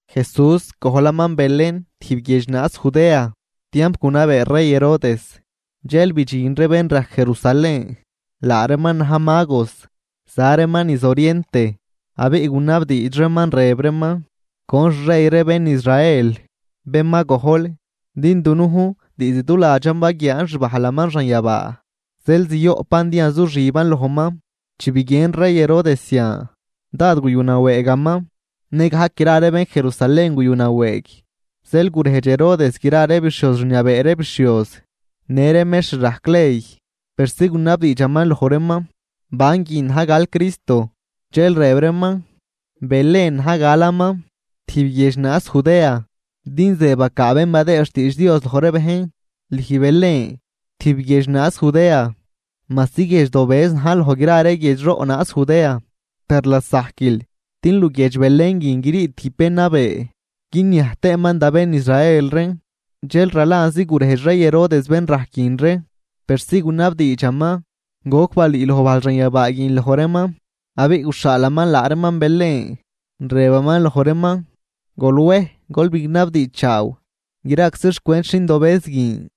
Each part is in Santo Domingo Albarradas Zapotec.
Jesús gojlaman Belén tijb guiedx naaz Judea, tiamp gunabee rey Herodes. Dxel bidxin ree bén rajc, Jerusalén, laa reeman na̱j magos, za reeman niz oriente. Abiꞌ gunabdiidx reeman, rëb reeman: ―¿Con xrey ree bén Israel, bén ma gojl? Din dunujn diizd duladxan baguiaan xbajlaman xanyabaa, zeel zioꞌpan din yazuxiban lojman. Chi biguien rey Herodes zian, dád guyunawëëgaman, nëgajc gra ree bén Jerusalén guyunawëëg. Zeel gurejdx Herodes gra ree bixhioz rniabee ree bixhioz, në ree mextr rajc ley, persi gunabdiidxaman loj reeman banguin na̱j gal Cristo. Dxel rëb reeman: ―Belén na̱j galaman, tijb guiedx naaz Judea, din ze bacaa bén badëë xtiidx Dios loj ree bejn: Lüj Belén, tijb guiedx naaz Judea, majsi guiedx dobëz najl loj gra ree guiedxroꞌ naaz Judea. Per lasajquil din luguiedx Belén guin grii tijb bén nabee guiniaj tëëman da bén Israel reen. Dxel ralanzi gurejdx rey Herodes bén rajc guin ree, persi gunabdiidxaman goc balüüloj bajl xanyabaa guin loj reeman. Abiꞌ guxhaalaman laa reeman Belén, rëbaman loj reeman: ―Gol wej, gol bignabdiidxchaaw graczi xcwent xindobëz guin.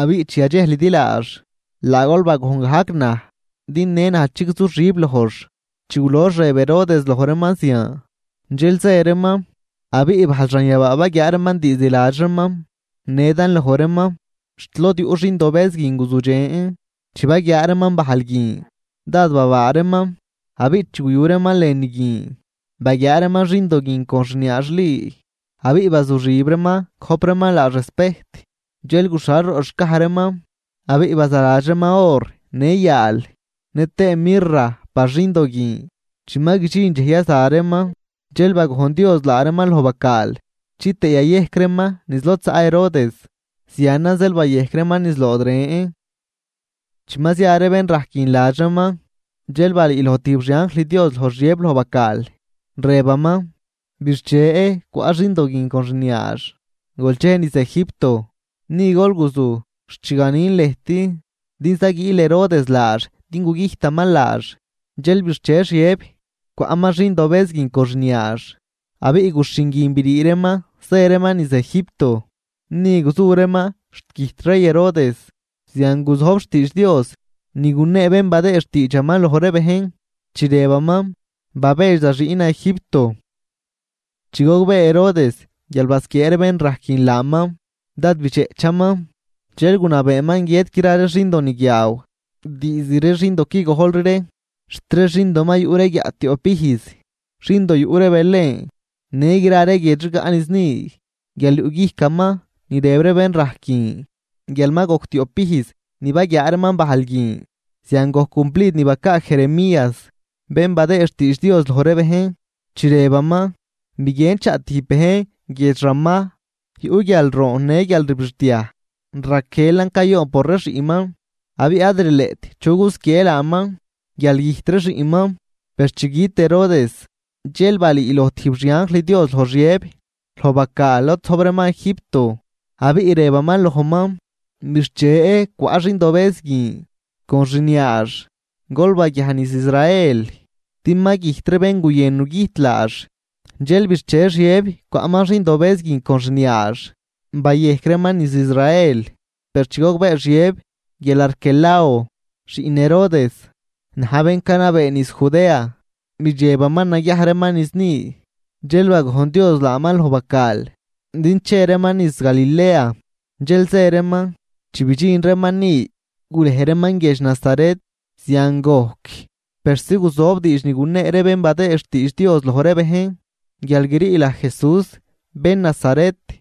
Abiꞌ chi yadxejlidi laax, laa gol bagojn gajc naj, din në naj chigzuxib lojx. Chi gulox rëb Herodes loj reeman zian, dxel zë reeman. Abiꞌ bajl xanyabaa baguiaa reeman diizd ladx reeman, nedan loj reeman, xt lod yuꞌ xindobëz guin guzudxen. Chi baguiaa reeman bajl guin, dád babaa reeman. Abiꞌ chi guyu reeman lënü guin, baguiaa reeman xindo guin con xniaax Li. Abiꞌ bazuxib reeman gojp reeman laax respejt. Dxel guxhal roꞌ xcaj reeman, abiꞌ bazaladx reeman or, në yaal, nëtëë mirra par xindo guin. Chi ma guidxin dxej yaza reeman, dxel bagojn Dios laa reeman loj bacaal chitëë yayejc reeman niz lod zaꞌ Herodes, zianan zeel bayejc reeman niz lood ren. Chi ma zia ree bén rajc guin ladx reeman, dxel balüüloj tijb xianjl Dios loj Xiëb loj bacaal, rëbaman: ―Bixche, cwaꞌ xindo guin con xniaax, gol chej niz Egipto. Ni gol guzuj xt chi ganin lëjt, din zaguiil Herodes laax din gugüjtaman laax. Dxel bixche Xiëb, cwaꞌman xindobëz guin con xniaax, abiꞌ guxhin guin brii reeman zë reeman niz Egipto. Ni guzu reeman xt güjt rey Herodes. Zian guzojb xtiidx Dios ni gunee bén badëë xtiidxaman loj ree bejn, chi rëbaman: “Babedx da xiꞌnan Egipto.” Chi gogbee Herodes guial basquiee ree bén rajc guin laaman, dád bidxeꞌchaman. Dxel gunabeeman guiët gra ree xindoniguiaaw diizd ree xindo qui gojlri ree xt ree xindo ma yuꞌ ree guiaꞌ tioꞌp ijz, xindo yuꞌ ree Belén në gra ree guiedx rigaꞌ niz ni, guial yuꞌguijcaman ni rëb ree bén rajc guin guial ma gojc tioꞌp ijz ni baguiaa reeman bajl guin. Zian gojc cumplid ni bacaa Jeremías, bén badëë xtiidx Dios loj ree bejn, chi rëbaman: Biguien chaꞌ tijb bejn guiedx Ramá, yuꞌ guialroon në guialrbixdiaj, Raquelan cayoon por ree xiꞌnman, abiꞌ ad rileꞌt chu gusquiejn laaman guial güjt ree xiꞌnman. Per chi güt Herodes, dxel balüüloj tijb xianjl Dios loj Xiëb loj bacaal lod zojb reeman, Egipto, abiꞌ rëbaman lojman: ―Bixche, cwaꞌ xindobëz guin con xniaax. Gol baguiaj niz Israel, din ma güjt ree bén guyën nugüjt laax. Dxel bixche Xiëb cwaꞌman xindobëz guin con xniaax, bayejc reeman niz Israel. Per chi gogbee Xiëb guial Arquelao, xiꞌn Herodes, na̱j bén canabee niz Judea, bidxebaman naguiaj reeman niz ni. Dxel bagojn Dios laaman loj bacaal din che reeman niz Galilea, dxel zë reeman. Chi bidxin reeman ni, gurej reeman guiedx Nazaret. Zian gojc persi guzojb diidx ni gunee ree bén badëë xtiidx Dios loj ree bejn, guial grii laj Jesús bén Nazaret.